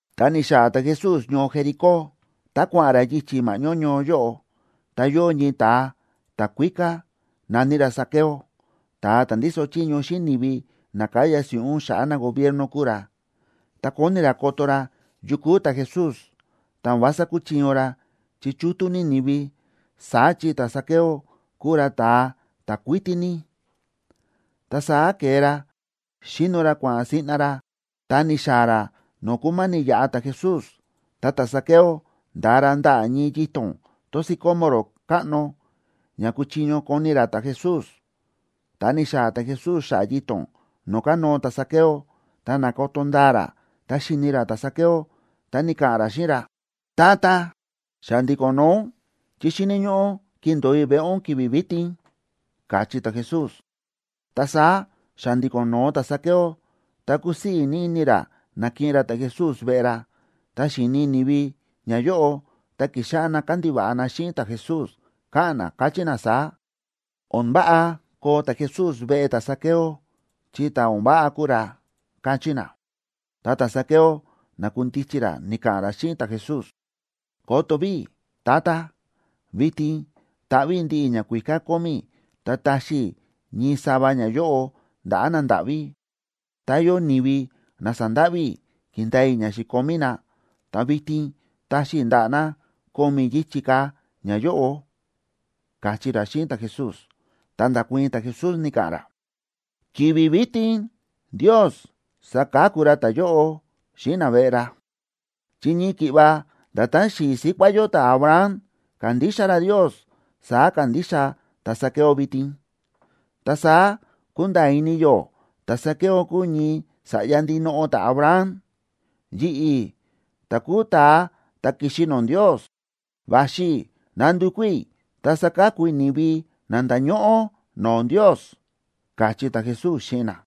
Ta ni̱xaa̱ ta̱Jesús ñoo Jericó, ta kua̱ꞌa̱n ra yichi̱ ma̱ꞌñó ñoo yóꞌo. Ta yóo ñii ta̱a ta̱kuíká na̱ní ra Zaqueo, ta̱a ta̱ ndíso chiño xíꞌin ni̱vi na káya si̱ꞌún xa̱ꞌa̱ nagobierno kúu ra. Ta kóni ra koto ra yu kúu ta̱Jesús, ta o̱n vása kúchiño ra, chi chútú ní ni̱vi. Saá chi ta̱Zaqueo kúu ra ta̱a ta̱ kuítí ní. Ta saá ke̱e ra, xi̱no ra kua̱ꞌa̱n siꞌna ra, ta ni̱xaa̱ ra no̱o̱ kúma̱ni̱ yaꞌa ta̱Jesús. Ta ta̱Zaqueo nda̱a ra ndaꞌa̱ ñii yito̱n tón sicómoro káꞌno, ña kuchiño koni ra ta̱Jesús. Ta ni̱xaa̱ ta̱Jesús xa̱ꞌa̱ yito̱n no̱o̱ kánóo ta̱Zaqueo, ta na̱koto ndaa ra, ta xi̱ni ra ta̱Zaqueo, ta ni̱ka̱ꞌa̱n ra xíꞌin ra: ―Tata, xa̱ndi̱ko̱n noo ún chi xíni̱ ñóꞌó kindo̱o i̱ veꞌe ún ki̱vi̱ vitin ―káchí ta̱Jesús. Ta saá xa̱ndi̱ko̱n no̱o ta̱Zaqueo, ta kúsii̱ ní ini ra na̱kiꞌin ra ta̱Jesús veꞌe ra. Tá xi̱ni̱ ni̱vi ñayóꞌo, ta ki̱xáꞌá na kándiva̱ꞌa na xíꞌin ta̱Jesús, káꞌa̱n na, káchí na saá: ―O̱n váꞌa koo ta̱Jesús veꞌe ta̱Zaqueo, chi ta̱ o̱n váꞌa kúu ra ―káchí na. Ta ta̱Zaqueo na̱kundichi ra ni̱ka̱ꞌa̱n ra xíꞌin ta̱Jesús: ―Koto ví, Tata, vitin taꞌví i̱ ndiꞌi ñakuíká kómí i̱, ta taxi i̱ ñii sava ñayóꞌo ndaꞌa̱ nandáꞌví. Tá yóo ni̱vi na sa̱ndáꞌví i̱ ki̱ndaa i̱ ña xi̱komí na, ta vitin taxi i̱ ndaꞌa̱ na ko̱mi̱ yichi̱ ka̱ ñayóꞌo ―káchí ra xíꞌin ta̱Jesús. Ta nda̱kuii̱n ta̱Jesús, ni̱ka̱ꞌa̱n ra: ―Ki̱vi̱ vitin Ndios sa̱ka̱ku ra ta̱yóꞌo xíꞌin naveꞌe ra, chi ñii ki̱ꞌva nda̱tán xi̱i̱ síkuá yó ta̱Abraham ka̱ndixa ra Ndios, saá kándixa ta̱Zaqueo vitin. Ta saá kúnda̱a̱ ini yó ta̱Zaqueo kúu ñii sa̱ꞌya ndinoꞌo ta̱Abraham. Yi̱ꞌi̱, ta̱ kúu ta̱a ta̱ ki̱xi no̱o̱ Ndios, va̱xi i̱ nandukú i̱ ta saka̱ku i̱ ni̱vi na nda̱ñóꞌó no̱o̱ Ndios ―káchí ta̱Jesús xíꞌin na.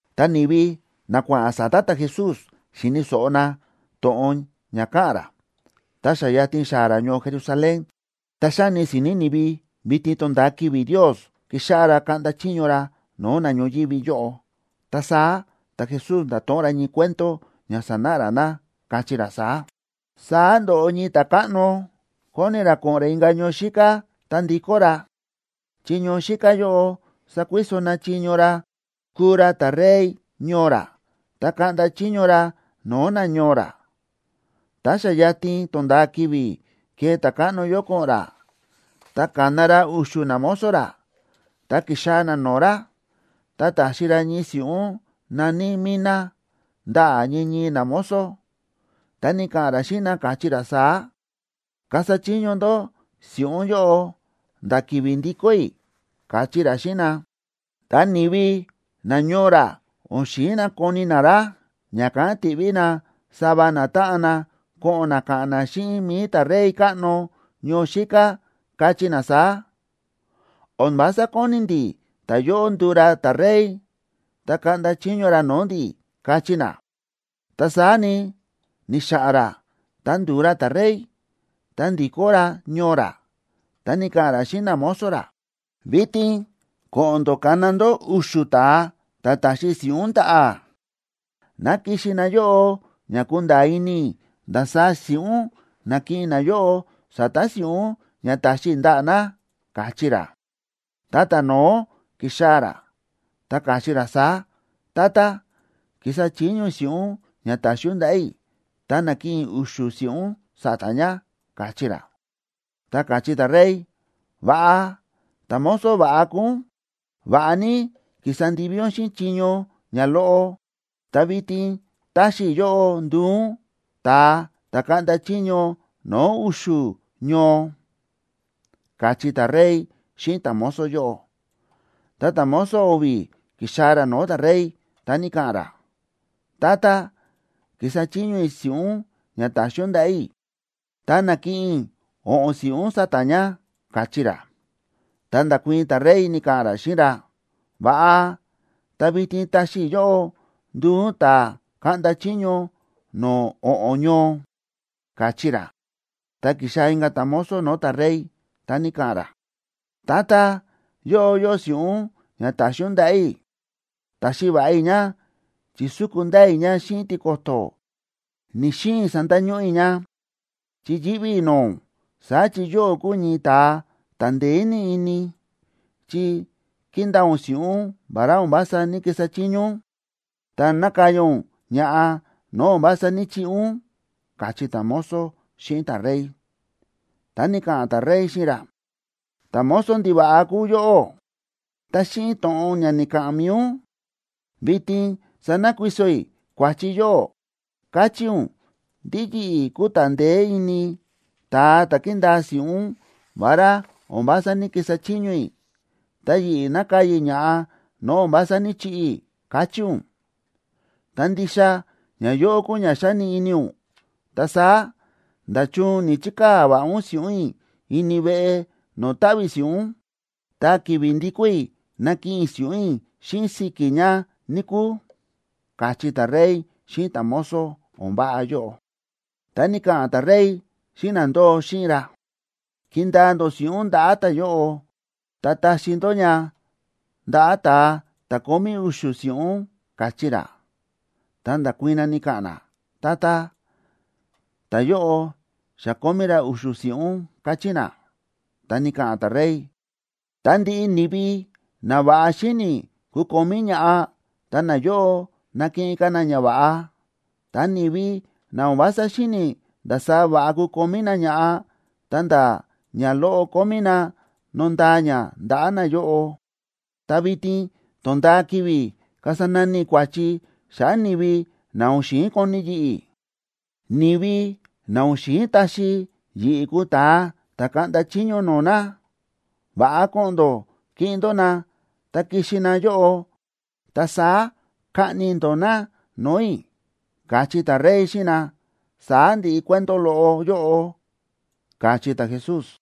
Ta ni̱vi na kua̱ꞌa̱n sa̱ta̱ ta̱Jesús xíni̱ so̱ꞌo na to̱ꞌon ña káꞌa̱n ra, ta xa yatin xaa̱ ra ñoo Jerusalén, ta xáni si̱ni̱ ni̱vi vitin tonda̱a ki̱vi̱ Ndios kixáꞌá ra kaꞌnda chiño ra no̱o̱ na ñoyívi yóꞌo. Ta saá ta̱Jesús nda̱to̱ꞌon ra ñii cuento ña sanáꞌa ra na, káchí ra saá: ―Saá ndo̱ꞌo ñii ta̱káꞌno, kóni ra ko̱ꞌo̱n ra inka̱ ñoo xíká, ta ndikó ra, chi ñoo xíká yóꞌo sakuiso na chiño ra kuu ra ta̱rey ñoo ra, ta kaꞌnda chiño ra no̱o̱ nañoo ra. Tá xa yatin tonda̱a ki̱vi̱ kee ta̱káꞌno yóꞌo ko̱ꞌo̱n ra, ta ka̱na ra u̱xu̱ namozo ra, ta ki̱xaa̱ na no̱o̱ ra. Ta ta̱xi ra ñii si̱ꞌún na̱ní minaa ndaꞌa̱ ñii ñii namozo, ta ni̱ka̱ꞌa̱n ra xíꞌin na, káchí ra saá: “Kasa chiño ndó si̱ꞌún yóꞌo nda̱ ki̱vi̱ ndikó i̱”, káchí ra xíꞌin na. Ta ni̱vi nañoo ra o̱n xi̱in na koni na ra, ña̱kán ti̱ꞌví na sava natáꞌan na ko̱ꞌo̱n na ka̱ꞌa̱n na xíꞌin mi̱i ta̱rey káꞌno ñoo xíká, kachí na saá: “O̱n vása kóni ndi̱ ta̱yóꞌo nduu ra ta̱rey, ta kaꞌnda chiño ra no̱o̱ ndi̱”, kachí na. Ta saá ni, ni̱xa̱ꞌa̱n ra, ta ndu̱u ra ta̱rey, ta ndi̱kó ra ñoo ra. Ta ni̱ka̱ꞌa̱n ra xíꞌin namozo ra: “Vitin ko̱ꞌo̱n ndó kana ndó u̱xu̱ ta̱a ta̱ ta̱xi i̱ si̱ꞌún ndaꞌa̱, ná kixi na yóꞌo ña kunda̱a̱ ini i̱ ndasaá si̱ꞌún na̱kiꞌin nayóꞌo sa̱ta̱ si̱ꞌún ña ta̱xi i̱ ndaꞌa̱ na”, káchí ra. Ta ta̱no̱ó ki̱xaa̱ ra, ta ka̱chí ra saá: “Tata, ki̱sa chiño i̱ si̱ꞌún ña ta̱xi ún ndaꞌa̱ i̱, ta na̱kiꞌin i̱ u̱xu̱ si̱ꞌún sa̱ta̱ ña”, káchí ra. Ta káchí ta̱rey: “Va̱ꞌa, ta̱mozo va̱ꞌa kúu ún. Va̱ꞌa ní ki̱sa ndivi ún xíꞌin chiño ñaloꞌo, ta vitin táxi i̱ yóꞌó nduu ún ta̱a ta̱ kaꞌnda chiño no̱o̱ u̱xu̱ ñoo”, káchí ta̱rey xíꞌin ta̱mozo yóꞌo. Ta ta̱mozo o̱vi̱ ki̱xaa̱ ra no̱o̱ ta̱rey, ta ni̱ka̱ꞌa̱n ra: “Tata, ki̱sa chiño i̱ si̱ꞌún ña ta̱xi ún ndaꞌa̱ i̱, ta na̱kiꞌin i̱ o̱ꞌo̱n si̱ꞌún sa̱ta̱ ña”, káchí ra. Ta nda̱kuii̱n ta̱rey, ni̱ka̱ꞌa̱n ra xíꞌin ra: “Va̱ꞌa, ta vitin taxi i̱ yóꞌó nduu ún ta̱ kaꞌnda chiño no̱o̱ o̱ꞌo̱n ñoo”, káchí ra. Ta ki̱xaa̱ inka̱ ta̱mozo no̱o̱ ta̱rey, ta ni̱ka̱ꞌa̱n ra: “Tata, yóꞌo yóo si̱ꞌún ña ta̱xi ún ndaꞌa̱ i̱. Ta̱xi va̱ꞌa i̱ ña, chi̱súku ndaa i̱ ña xíꞌin tiko̱to̱. Ni̱‑xiin sandañóꞌó i̱ ña, chi yíꞌví i̱ no̱o̱ ún. Saá chi yóꞌó kúu ñii ta̱a ta̱ ndeé ní ini, chi kíndaa ún si̱ꞌún vará o̱n vása ní‑kisa chiño ún, ta nákaya ún ña̱ꞌa no̱o̱ o̱n vása ní‑chiꞌi ún”, káchí ta̱mozo xíꞌin ta̱rey. Ta ni̱ka̱ꞌa̱n ta̱rey xíꞌin ra: “¡Ta̱mozo ndiva̱ꞌa kúu yóꞌó! Ta xíꞌin to̱ꞌon ña ni̱ka̱ꞌa̱n mi̱i ún, vitin sanakuiso i̱ kua̱chi yóꞌó. Káchí ún ndí yi̱ꞌi̱ kúu ta̱ ndeé ini, ta̱a ta̱ kíndaa si̱ꞌún vará o̱n vása ní‑kisa chiño i̱, ta yi̱ꞌi̱ nákaya ña̱ꞌa no̱o̱ o̱n vása ní‑chiꞌi i̱, káchí ún. Tá ndixa ñayóꞌo kúu ña xáni ini ún, ta saá, ¿nda̱chun ni̱‑chikaa̱ va̱ꞌa ún si̱ꞌún i̱ ini veꞌe no̱o̱ táꞌví si̱ꞌún?, ta ki̱vi̱ ndi̱kó i̱, nakiꞌin i̱ si̱ꞌún i̱ xíꞌin si̱ki̱ ña, níkúu”, káchí ta̱rey xíꞌin ta̱mozo o̱n váꞌa yóꞌo. Ta ni̱ka̱ꞌa̱n ta̱rey xíꞌin na ndóo xíꞌin ra: “Kindaa ndó si̱ꞌún ndaꞌa̱ ta̱yóꞌo, ta taxi ndó ña ndaꞌa̱ ta̱a ta̱ kómí u̱xu̱ si̱ꞌún”, káchí ra. Ta nda̱kuii̱n na, ni̱ka̱ꞌa̱n na: “Tata, ta̱yóꞌo xa kómí ra u̱xu̱ si̱ꞌún”, káchí na. Ta ni̱ka̱ꞌa̱n ta̱rey: “Ta ndiꞌi ni̱vi na va̱ꞌa xíni̱ kukomí ña̱ꞌa, ta nayóꞌo nakiꞌin ka̱ na ñava̱ꞌa. Ta ni̱vi na o̱n vása xíni̱ ndasaá va̱ꞌa kukomí na ña̱ꞌa, ta̱nda̱ ñaloꞌo kómí na, nondaa ña ndaꞌa̱ nayóꞌo. Ta vitin tónda̱a ki̱vi̱ kasa nani i̱ kua̱chi xa̱ꞌa̱ ni̱vi na o̱n xi̱in koni yi̱ꞌi̱, ni̱vi na o̱n xi̱in taxi yi̱ꞌi̱ kuu ta̱a ta̱ kaꞌnda chiño no̱o̱ na. Va̱ꞌa ko̱ꞌo̱n ndó kiꞌin ndó na ta kixi na yóꞌo, ta saá kaꞌni ndó na no̱o̱ i̱”, káchí ta̱rey xíꞌin na. Saá ndi̱ꞌi cuento loꞌo yóꞌo ―káchí ta̱Jesús.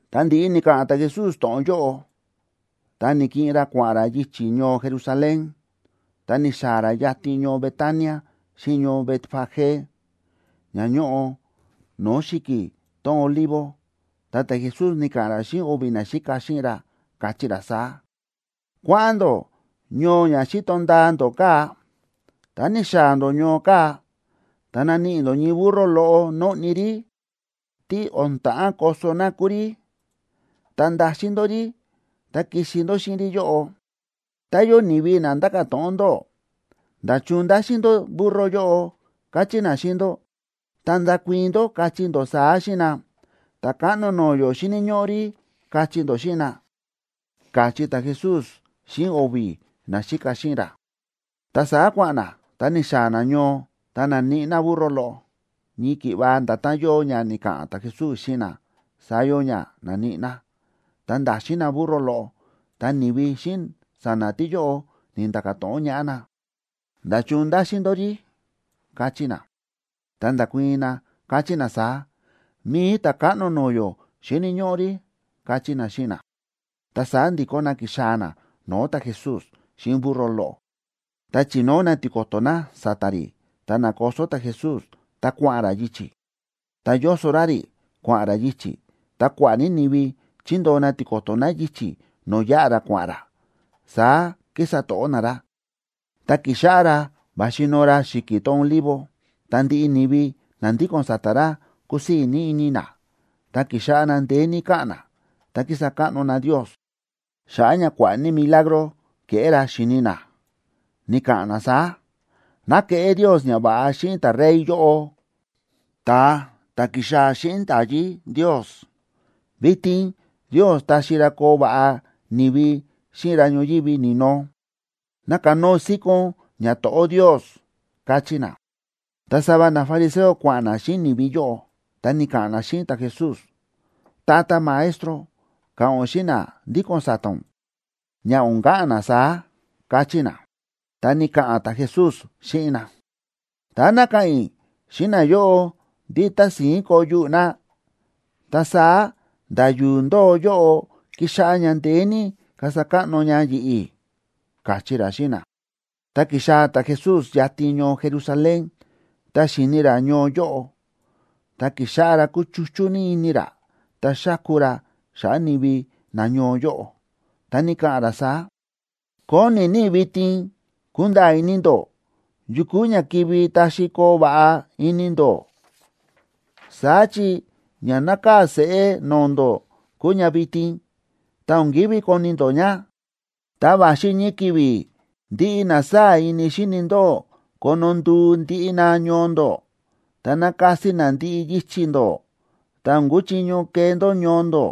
Ta ndi̱ꞌi ni̱ka̱ꞌa̱n ta̱Jesús to̱ꞌon yóꞌo, ta na̱kiꞌin ra kua̱ꞌa̱n ra yichi̱ ñoo Jerusalén. Ta ni̱xaa̱ ra yatin ñoo Betania xíꞌin ñoo Betfagé, ña ñóꞌo no̱o̱ xi̱ki̱ tón Olivo. Ta ta̱Jesús ni̱ka̱ꞌa̱n ra xíꞌin o̱vi̱ naxíka xíꞌin ra, káchí ra saá: ―Kua̱ꞌa̱n ndó ñoo ña xíto ndaa ndó kaa̱. Ta ni̱xaa̱ ndó ñoo kaa̱, ta naníꞌi ndó ñii burro loꞌo nóꞌni rí, tí o̱n ta̱ꞌán koso na kúu rí. Ta ndaxin ndó rí ta kixi ndó xíꞌin rí yóꞌo. Tá yóo ni̱vi na nda̱ka̱ to̱ꞌon ndóꞌó: “¿Nda̱chun ndáxin ndó burro yóꞌo?”, kachí na xíꞌin ndó, ta ndakuii̱n ndó, kachí ndó saá xíꞌin na: “Ta̱káꞌno no̱o̱ yó xíni̱ ñóꞌó rí”, kachí ndó xíꞌin na ―káchí ta̱Jesús xíꞌin o̱vi̱ naxíka xíꞌin ra. Ta saá kua̱ꞌa̱n na, ta ni̱xaa̱ na ñoo ta na̱níꞌi na burro loꞌo. Ñii ki̱ꞌva nda̱tán yóo ña ni̱ka̱ꞌa̱n ta̱Jesús xíꞌin na, saá yóo ña na̱níꞌi na. Tá ndáxin na burro loꞌo, ta ni̱vi xíꞌin sa̱na̱ tíyóꞌo, ni̱nda̱ka̱ to̱ꞌon ñaꞌá na: ―¿Nda̱chun ndáxin ndó rí? ―káchí na. Ta nda̱kuii̱n na, káchí na saá: ―Mi̱i Ta̱káꞌno no̱o̱ yó xíni̱ ñóꞌó rí ―káchí na xíꞌin na. Ta saá ndi̱kó na ki̱xaa̱ na no̱o̱ ta̱Jesús xíꞌin burro loꞌo, ta chi̱nóo na tiko̱to̱ na sa̱ta̱ rí, ta na̱koso ta̱Jesús ta kua̱ꞌa̱n ra yichi̱. Tá yóso ra rí, kua̱ꞌa̱n ra yichi̱, ta kua̱ꞌa̱ ní ni̱vi chi̱ndoo na tiko̱to̱ na yichi̱ no̱o̱ yáꞌa ra kua̱ꞌa̱n ra, saá kísa to̱ꞌó na ra. Tá ki̱xáꞌá ra va̱xi noo ra xi̱ki̱ tón Olivo, ta ndiꞌi ni̱vi na ndíko̱n sa̱ta̱ ra kúsii̱ ní ini na, ta ki̱xáꞌá na ndeé ní káꞌa̱n na, ta kísa káꞌno na Ndios xa̱ꞌa̱ ña kua̱ꞌa̱ ní milagro ke̱ꞌé ra, xi̱ni na. Ni̱ka̱ꞌa̱n na saá: ―¡Ná keꞌé Ndios ñava̱ꞌa xíꞌin ta̱rey yóꞌo, ta̱a ta̱ ki̱xaa̱ xíꞌin nda̱yí Ndios! ¡Vitin Ndios taxi ra koo va̱ꞌa ni̱vi xíꞌin ra ñoyívi ni̱no! ¡Ná kanóo síkón ñato̱ꞌó Ndios! ―káchí na. Ta sava nafariseo kua̱ꞌa̱n na xíꞌin ni̱vi yóꞌo, ta ni̱ka̱ꞌa̱n na xíꞌin ta̱Jesús: ―Tata Maestro, ka̱ꞌa̱n ún xíꞌin na ndíko̱n sa̱ta̱ ún, ña o̱n ka̱ꞌa̱n na saá ―káchí na. Ta ni̱ka̱ꞌa̱n ta̱Jesús xíꞌin na: ―Tá ná ka̱ꞌa̱n i̱ xíꞌin nayóꞌo ndí tási̱ín koo yuꞌu̱ na, ta saá nda̱ yu̱u̱ ndóo yóꞌo kixáꞌá ña ndeé ní kasa káꞌno ña yi̱ꞌi̱ ―káchí ra xíꞌin na. Ta ki̱xaa̱ ta̱Jesús yatin ñoo Jerusalén. Tá xi̱ni̱ ra ñoo yóꞌo, ta ki̱xáꞌá ra kúchuchú ní ini ra, ta xáku ra xa̱ꞌa̱ ni̱vi nañoo yóꞌo, ta ni̱ka̱ꞌa̱n ra saá: ―¡Kóni ní i̱ vitin kunda̱a̱ ini ndó yu kúu ña kivi taxi koo va̱ꞌa ini ndó! Saá chi ña nákaa̱ seꞌé no̱o̱ ndó kúu ña vitin, ta o̱n ki̱ví koni ndó ña. Ta va̱xi ñii ki̱vi̱ ndiꞌi na sáa̱ ini xíni ndóꞌó kono nduu ndiꞌi na ñoo ndó, ta nakasi na ndiꞌi yichi̱ ndó, ta o̱n kuchiño kee ndó ñoo ndó.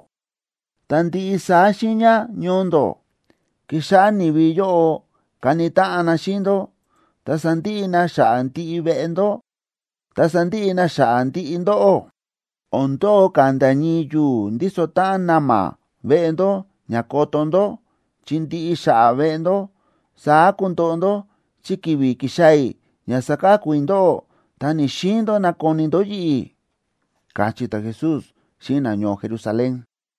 Ta ndiꞌi saá xiiña ñoo ndó, kixáꞌá ni̱vi yóꞌo kani táꞌan na xíꞌin ndó. Ta sandiꞌi na xa̱ꞌa̱ ndiꞌi veꞌe ndó, ta sandiꞌi na xa̱ꞌa̱ ndiꞌi ndóꞌó. O̱n ndo̱o ka̱ nda̱ ñii yu̱u̱ ndíso táꞌan na̱ma̱ veꞌe ndó ña koto ndó, chi ndiꞌi xa̱ꞌa̱ veꞌe ndó. Saá kundoꞌo ndó chi ki̱vi̱ ki̱xaa̱ i̱ ña saka̱ku i̱ ndóꞌó, ta ni̱‑xiin ndó nakoni ndó yi̱ꞌi̱ ―káchí ta̱Jesús xíꞌin nañoo Jerusalén.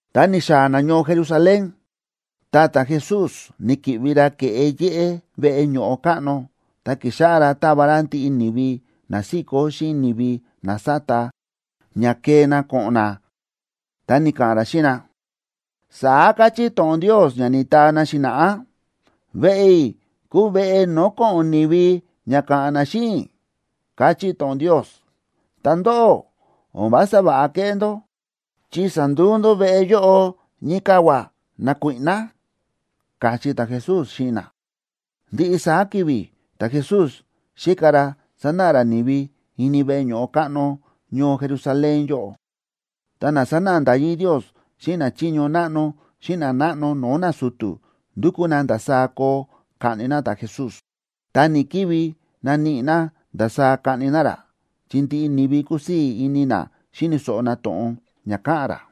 Ta ni̱xaa̱ na ñoo Jerusalén, ta ta̱Jesús ni̱ki̱ꞌvi ra ke̱ꞌe yéꞌé veꞌe ño̱ꞌo káꞌno, ta ki̱xáꞌá ra táva ra ndiꞌi ni̱vi na síkó xíꞌin ni̱vi na sáta, ña kee na ko̱ꞌo̱n na. Ta ni̱ka̱ꞌa̱n ra xíꞌin na: ―Saá káchí to̱ꞌon Ndios ña ni̱taa na xi̱na̱ꞌá: “Veꞌe i̱ kuu veꞌe no̱o̱ ko̱ꞌo̱n ni̱vi ña ka̱ꞌa̱n na xíꞌin i̱”, káchí to̱ꞌon Ndios. Ta ndóꞌó, o̱n vása va̱ꞌa kéꞌé ndó, chi sa̱nduu ndó veꞌe yóꞌo ñii kavua̱ nakuíꞌná ―káchí ta̱Jesús xíꞌin na. Ndiꞌi saá ki̱vi̱ ta̱Jesús xíka ra sánáꞌa ra ni̱vi ini veꞌe ño̱ꞌo káꞌno ñoo Jerusalén yóꞌo, ta na sánáꞌa nda̱yí Ndios xíꞌin nachiño náꞌno xíꞌin nanáꞌno no̱o̱ nasu̱tu̱, ndúkú na ndasaá koo kaꞌni na ta̱Jesús. Ta ni̱‑kivi naníꞌi na ndasaá kaꞌni na ra, chi ndiꞌi ni̱vi kúsii̱ ini na xíni̱ so̱ꞌo na to̱ꞌon ña káꞌa̱n ra.